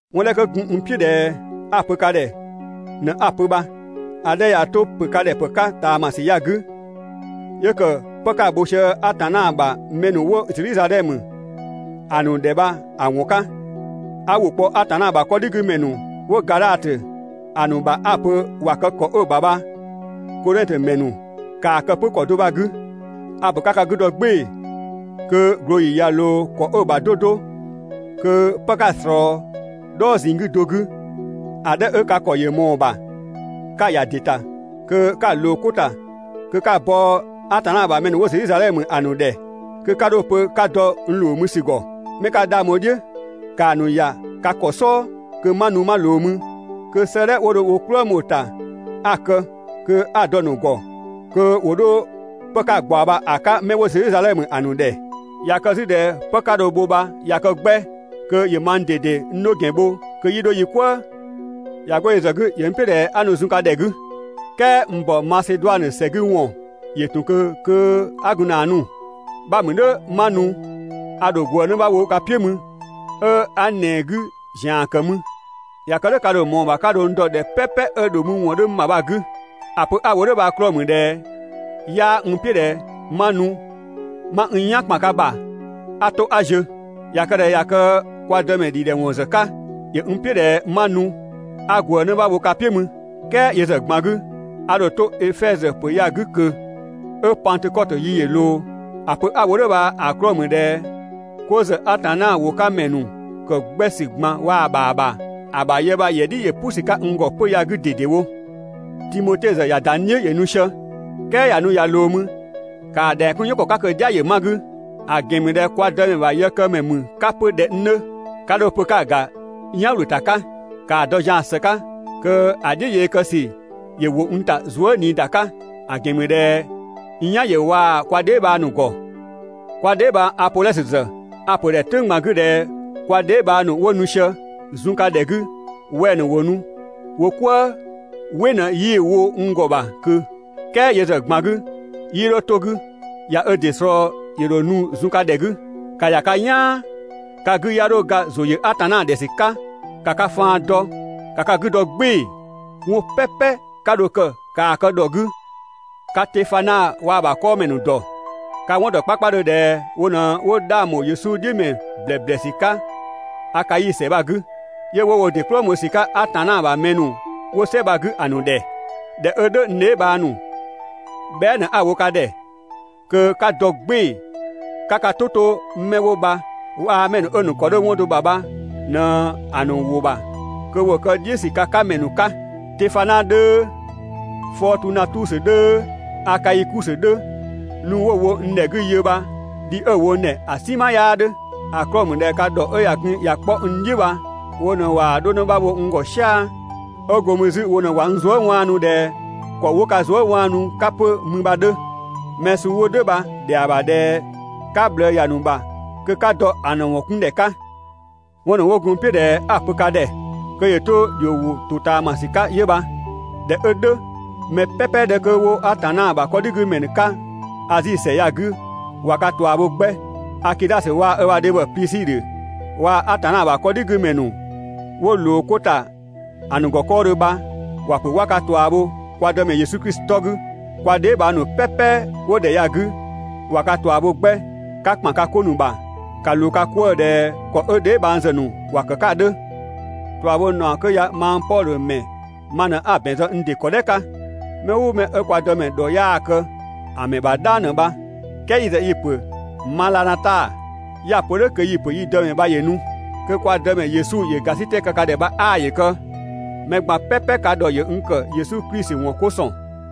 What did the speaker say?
'Wɔn 'dhɛ 'kö gun n "piʋ̈ ꞊dhɛ 'a‑ pö ka ‑dhɛ ꞊në 'a‑ pö bha. ‑A 'dhɛ 'ö ꞊ya 'to ‑pö ka ‑dhɛ ‑pë 'ka ꞊taamasü ya‑ 'gü, 'yö ‑kë 'pë 'ka‑ bho sië Atanna ‑bha mɛ ‑nu 'wo Zedhizadhɛmö ‑a ‑nu ‑dhɛ bha‑ ‑wɔn 'ka. 'A ‑wʋ kpɔ Atanna ‑bha 'kɔdhigümɛ ‑nu 'wo Gadhatö ‑a ‑nu ‑bha 'a‑ pö ‑wa kë ‑kɔ 'ö‑ ‑bha bha, Kodhɛngtö ‑mɛ ‑nu, ‑kaa kë 'pö ‑kɔ do bha‑ 'gü. A‑ ‑pö 'ka ka 'gü dɔ "gbɩɩ‑ kö ꞊glooyi ꞊ya ꞊loo ‑kɔ 'ö‑ ‑bha 'do 'do, kö 'pë 'ka‑ ꞊slɔɔ "dhɔɔ ꞊zinng 'gü do 'gü, ‑a 'dhɛ 'ö ka ‑kɔ ‑yö ꞊mɔɔ‑ ‑bha, 'ka‑ ‑ya ‑dɩ ‑ta kö 'ka‑ ꞊loo 'ko ‑ta kö 'ka‑ bɔ Atanna ‑bha mɛ ‑nu 'wo Zedhizadhɛmö ‑a ‑nu ‑dhɛ, kö 'ka 'dho‑ pö 'ka dɔ n ‑loo mü ‑sü ‑gɔ. 'Mɛ 'ka 'dhang bho‑ "dhiʋ̈, ‑kaa ‑nu ‑ya ka ‑kɔ "sɔɔ kö 'ma nu 'ma ꞊loo mü, kö 'sëëdhɛ 'wo dho wo "kplëng bho‑ ‑ta 'a‑ kë kö 'a‑ dɔ‑ ‑nu ‑gɔ kö ‑wo 'dho 'pë 'ka‑ ꞊gbaɔ bha‑ 'ka 'mɛ 'wo Zedhizadhɛmö ‑a ‑nu ‑dhɛ. ꞊Ya kë 'zü ꞊dhɛ 'pë 'ka dho‑ bho bha ꞊ya kë 'gbɛ, kö ‑yö mang ꞊dede n 'dho ‑gɛn bho, kö 'yi 'dho yi "kwëë. ꞊Ya 'go yö ‑zë 'gü, ‑yö n "piʋ̈ ꞊dhɛ 'a nu zun ka ‑dhɛ 'gü. "Kɛɛ n ‑bɔ Maseduanö ‑sɛ 'gü ‑wɔn ‑yö ‑tun ꞊kö 'kö 'a gun ‑na nu. 'Bha mü "dhʋ̈ 'ma nu a ‑dho ꞊gwëë 'në 'bha bho ka "piʋ̈ mü, 'ö 'a ‑nɛɛ 'gü ‑zian ‑kë mü. ꞊Ya kë "dhʋ̈ ka ‑dho ꞊mɔɔ‑ ‑bha 'ka dho n dɔ ‑dhɛ "pɛpɛ 'ö ‑dho mü ‑wɔn 'dhö n ‑bha bha‑ 'gü. ‑A pö 'a‑ wo "dhʋ̈ bha‑ 'klɔɔ‑ ‑mü ꞊dhɛ 'yaa n "piʋ̈ ꞊dhɛ 'ma nu 'ma n "yan ‑kpan ka ‑bha 'a 'to 'a ziö. ꞊Ya kë ꞊dhɛ ꞊ya kë kwa Dëmɛ ‑dhidhɛwɔn ‑zë 'ka, ‑yö n "piʋ̈ ꞊dhɛ 'ma nu 'a ꞊gwëë 'në 'bha wo ka "piʋ̈ mü. "Kɛɛ yö ‑zë ꞊gban 'gü, a ‑dho to Efɛzö ‑pö ya‑ 'gü ꞊kö 'ö Pangtökɔtö yi ‑yö ꞊loo. ‑A pö 'a‑ wo "dhʋ̈ bha‑ 'klɔɔ‑ ‑mü ꞊dhɛ 'ko ‑zë Atanna ‑wʋ 'ka ‑mɛ ‑nu ‑kë 'gbɛ ‑sü ꞊gban waa‑ ‑bha ‑bha, ‑a ‑bha yë bha‑ ‑yɛ "dhi ‑yö "pʋ ‑sü 'ka n ‑gɔ 'pö‑ ya‑ 'gü ꞊dedewo. Timote ‑zë ꞊ya ‑da n "dhiʋ̈ ‑yö nu sië, "kɛɛ ꞊ya nu ꞊ya ꞊loo mü ‑kaa ‑dhɛng 'kun "yɔn ‑kɔ 'ka kö‑ "dhia ‑yö 'ma‑ 'gü, ‑a ‑gɛn ‑mü ꞊dhɛ kwa Dëmɛ ‑bha yëkëmɛ ‑mü 'ka 'pö ꞊dhɛ n 'dhö. 'Ka 'dho‑ pö 'ka‑ ‑ga "yan ‑wlö ‑ta 'ka. ‑Kaa dɔ zian‑ ‑së 'ka kö‑ "dhiʋ̈ yee kë ‑sü ‑yö ‑wo n ‑ta zuë" ꞊nii ‑da 'ka, ‑a ‑gɛn ‑mü ꞊dhɛ n "yan ‑yö waa‑ kwa dheebhang ‑nu ‑gɔ. Kwa dheebhang Apodhɔsö ‑zë a‑ ‑pö ‑dhɛ "tʋ̈ng ꞊gban 'gü ꞊dhɛ kwa dheebhang ‑nu 'wo nu sië zun ka ‑dhɛ 'gü wɛng‑ ‑nu ‑wo nu wo "kwëë, "wɩ ꞊në 'yii‑ wo n ‑gɔ ‑bha ꞊kö. "Kɛɛ yö ‑zë ꞊gban 'gü 'yii 'dho 'to‑ 'gü, ꞊ya ö ‑dɩ ꞊slɔɔ ‑yö ‑dho nu zun ka ‑dhɛ 'gü. ‑Ka ‑ya ka "yaan, ka 'gü 'ya 'dho ga ‑zʋ ‑yö Atanna ‑dhɛ ‑sü 'ka, ‑ka ka faan dɔ, ‑ka ka 'gü dɔ "gbɩɩ‑. 'Wɔn "pɛpɛ 'ka dho‑ kë, ‑kaa kë ‑dhɔ 'gü. Ka Tefana waa‑ ‑bha 'kɔɔmɛ ‑nu ‑dɔ. Ka‑ 'wɔn ‑dɔ 'kpakpadhö ꞊dhɛ wo ꞊në 'wo 'dhang bho Yesu ‑wɔn "dhiʋ̈ ‑blɛblɛsü Akai ‑sɛ bha‑ 'gü, 'yö 'wo wo ‑dɩ "kplëng bho ‑sü 'ka Atanna ‑bha mɛ ‑nu 'wo "sɛ bha‑ 'gü ‑a ‑nu ‑dhɛ. ꞊Dhɛ 'ö "dhʋ̈ n dheebhang ‑nu, bhɛa" ꞊në 'a‑ wo ka ‑dhɛ, kö 'ka dɔ "gbɩɩ‑ 'ka ka "tʋ 'to 'mɛ 'wo bha waa‑ mɛ ‑nu 'ö‑ ‑nu ‑kɔ 'dhö 'wɔn do ‑bha bha ꞊në‑ ‑nu ‑wʋ ‑bha kö ‑wo kë "dhiʋ̈ ‑sü ka 'ka ‑mɛ ‑nu 'ka. Tefana 'dhöö, Fɔɔtunatusö 'dhöö, Akaikusö 'dhö, nu 'wo‑ wo ‑wo n ‑dhɛ 'gü yö bha dhi 'ö‑ wo n ‑dhɛ ‑a "sinma 'yaa 'dhö. ‑A 'klɔɔ‑ ‑mü ꞊dhɛ ka ‑dhɔ 'ö ꞊ya gun ꞊ya 'kpɔ n "dhiʋ̈ bha, wo ꞊në ꞊waa‑ 'dho 'në 'bha wo n ‑gɔ "sia‑. 'Ö go mü 'zü wo ꞊në ꞊wa n zuë" 'waanu ꞊dhɛ ‑kɔ 'wo ka zuë" 'waanu 'ka 'pö mü bha‑ 'dhö. Mɛ suu 'wo "dhʋ̈ bha‑ ‑dhɛa ‑bha ‑dhɛ 'ka ꞊bhlëë ‑ya ‑nu ‑bha kö 'ka dɔ‑ ‑nu ‑wɔn 'kun ‑dhɛ 'ka. ('Wɔn ‑nu 'wo gun n "piʋ̈ ꞊dhɛ 'a‑ pö ka ‑dhɛ kö ‑yö 'to ‑dhio ‑wʋ ‑totaamasü 'ka 'yö bha.) ꞊Dhɛ 'ö "dhʋ̈, mɛ "pɛpɛ 'dhɛ 'kö 'wo Atanna ‑bha 'kɔdhigümɛ 'ka Azi ‑sɛ ya‑ 'gü ꞊wa ka ꞊tua bho 'gbɛ. Akidhasö waa‑ ‑bha dhebhɔ Plisidhö waa‑ Atanna ‑bha 'kɔdhigümɛ ‑nu 'wo ꞊loo 'ko ‑ta ‑a ‑nu ‑gɔ 'kɔɔdhö bha, ‑wa ‑pö 'wa ka ꞊tua bho kwa Dëmɛ Yesu Klisi 'tɔ 'gü. Kwa dheebhang ‑nu "pɛpɛ 'wo ‑dhɛ ya‑ 'gü ꞊wa ka ꞊tua bho 'gbɛ. 'Ka ‑kpan ka 'ko ‑nu ‑bha ‑ka ꞊loo ka 'kwëë‑ ꞊dhɛ ‑kɔ 'ö dheebhang ‑zë ‑nu ‑wa ‑kë 'ka ‑a 'dhö. ꞊Tuabhonaɔ 'kö ya mang Pɔdhö ‑mɛ ma ꞊në 'a‑ ‑bɛn zë n ‑dɩ ‑kɔ "dhɛ 'ka. Mɛ "ʋʋ mɛ 'ö kwa Dëmɛ ‑dhɔ 'yaa‑ kë ‑a ‑mɛ ‑bha "dhang ꞊në bha! "Kɛɛ yi ‑zë yi‑ ‑pö «Madhanata»! 'Ya‑ pö "dhʋ̈ kö yi‑ ‑pö yi Dëmɛ bha ‑yö nu. Kö kwa Dëmɛ Yesu ‑yö ‑gasitɛ kë ka ‑dhɛ bha 'aa ‑yö kë. Mɛ ꞊gban "pɛpɛ ka ‑dhɔ ‑yö n ‑kë Yesu Klisi ‑wɔn 'ko ‑sɔn.